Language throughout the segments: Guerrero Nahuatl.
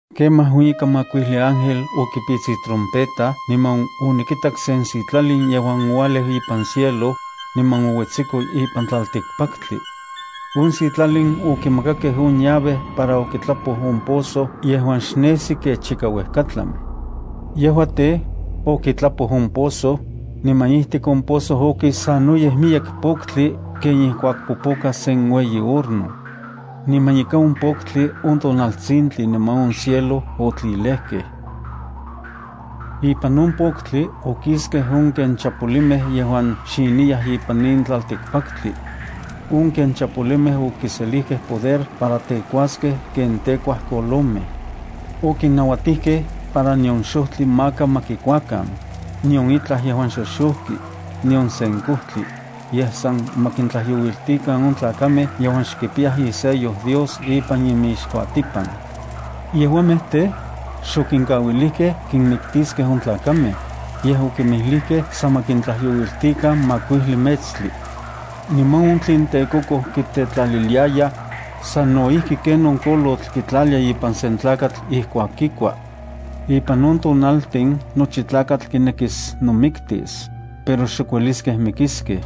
Kemaj on ika makuijli ángel okipits itrompeta niman onikitak sen sitlalin yejuan oualeu ipan cielo, niman ouetsiko ipan tlaltikpaktli. On sitlalin okimakakej on llave para okitlapoj on pozo yejuan xnejsi kech ika uejkatlan. Yejua tej, okitlapoj on pozo, niman ijtik on pozo okis sanoyej miyek poktli ken ijkuak popoka sen ueyi horno. Niman ika on poktli on tonaltsintli niman on cielo otlilejkej. Ipan on poktli, okiskej on ken chapolimej yejuan xiniyaj ipan in tlaltikpaktli. On ken chapolimej okiselijkej poder para tekuaskej ken tekuaj kolomej. Okinnauatijkej para nion xojtli maka ma kikuakan, nion itlaj yejuan xoxojki, nion sen kojtli, yej san ma kintlajyouiltikan on tlakamej yejuan xkipiyaj isello Dios ipan inmixkuatipan. Yejuamej tej, xokinkauilijkej kinmiktiskej on tlakamej, yej okinmijlijkej san ma kintlajyouiltikan makuijli metstli. Niman on tlen tekokoj kitetlaliliyayaj, sano ijki ken on kolotl kitlalia ipan sen tlakatl ijkuak kikua. Ipan on tonaltin nochi tlakatl kinekis nomiktis, pero xok ueliskej mikiskej.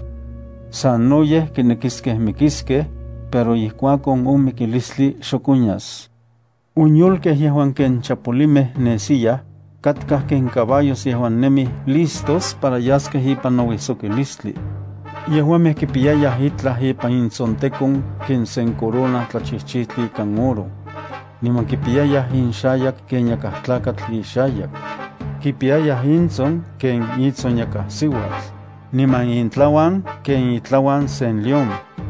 Sanoyej kinekiskej mikiskej, pero ijkuakon on mikilistli xok onyas. On yolkej yejuan ken chapolimej nesiyaj, katkaj ken caballos yejuan nemij listos para yaskej ipan nouijsokilistli. Yejuamej kipiyayaj itlaj ipan intsontekon ken sen corona tlachijchijtli ikan oro. Niman kipiyayaj inxayak ken yakaj tlakatl ixayak. Kipiyayaj intson ken itson yakaj siuatl, niman intlauan ken itlauan sen león.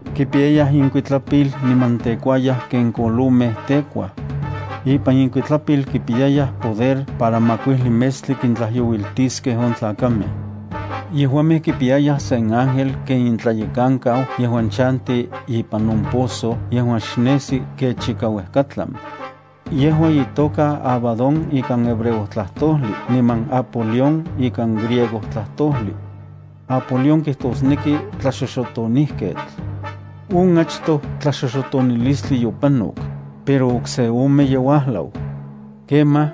Kipiyayaj inkuitlapil niman tekuayaj ken kolomej tekuaj. Ipan inkuitlapil kipiyayaj poder para makuijli metstli kintlayouiltiskej on tlakamej. Yejuamej kipiyayaj sen ángel ken intlayekankau yejuan chanti ipan on pozo yejuan xnesi kech ika uejkatlan. Yejua itoka Abadón ikan hebreo tlajtojli niman Apolión ikan griego tlajtojli. Apolión kijtosneki tlaxoxotonijketl. On achtoj tlaxoxotonilistli yopanok, pero okse ome ye uajlau. Kemaj,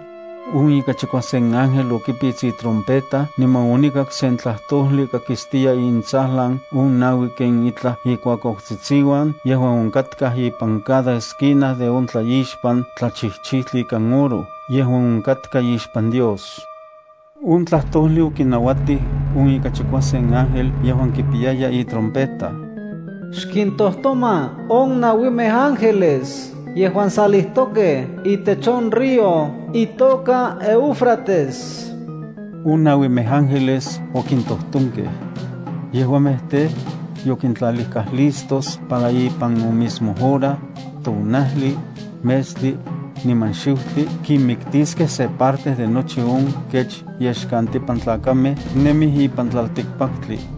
on ika chikuasen ángel okipits itrompeta, niman onikak sen tlajtojli kakistiya intsajlan on naui ken itlaj ikuakuautsitsiuan yejuan onkatkaj ipan cada esquina de on tlaixpan tlachijchijtli ikan oro yejuan onkatka ixpan Dios. On tlajtojli okinauatij on ika chikuasen ángel yejuan kipiyaya itrompeta: “Xkintojtoma on nauimej ángeles yejuan salijtokej itech on río itoka Éufrates.” On nauimej ángeles okintojtonkej. Yejuamej tej, yokintlalijkaj listos para ipan on mismo hora, tonajli, metstli, niman xiutli kinmiktiskej se parte de nochi on kech yexkantipan tlakamej nemij ipan tlaltikpaktli.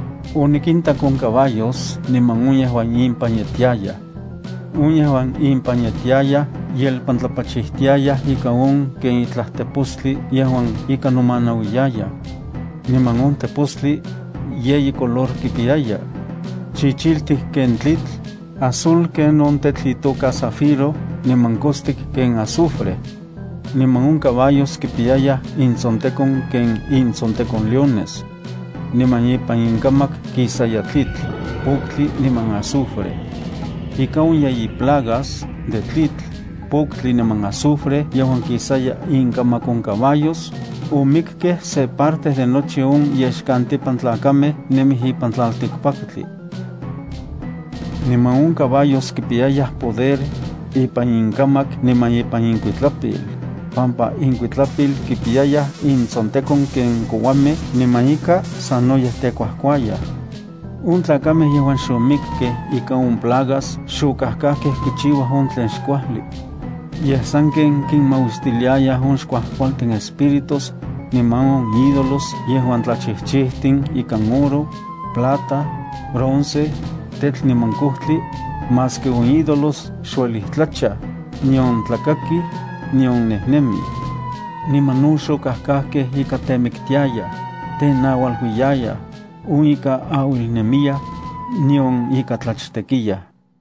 Onikintak on caballos niman on yejuan impan yetiayaj. On yejuan impan yetiayaj yelpantlapachijtiayaj ikan on ken itlaj tepostli yejuan ika nomanauiyayaj. Niman on tepostli, yeyi color kipiyaya: chichiltik ken tlitl, azul ken on tetl itoka zafiro niman kostik ken azufre. Niman on caballos kipiyayaj intsontekon ken intsontekon leones. Niman ipan inkamak kisaya tlitl, poktli niman azufre. Ika on yeyi plagas de tlitl, poktli niman azufre yejuan kisaya inkamak on caballos, omikkej se parte de nochi on yexkantipan tlakamej nemij ipan tlaltikpaktli. Niman on caballos kipiyayaj poder ipan inkamak niman ipan inkuitlapil, pampa inkuitlapil kipiyayaj intsontekon ken kouamej niman ika sanoyej tejkuajkuayaj. On tlakamej yejuan xomikkej ikan on plagas xokajkajkej kichiuaj on tlen xkuajli. Yej sanken kinmauistiliayaj on xkuajkualtin espíritus, niman on ídolos yejuan tlachijchijtin ikan oro, plata, bronce, tetl niman kojtli, maski on ídolos xuelij tlachaj, nion tlakakij, nion nejnemij. Niman no xokajkajkej ika temiktiayaj, tenaualuiyayaj, on ika auilnemiyaj, nion ika tlachtekiyaj.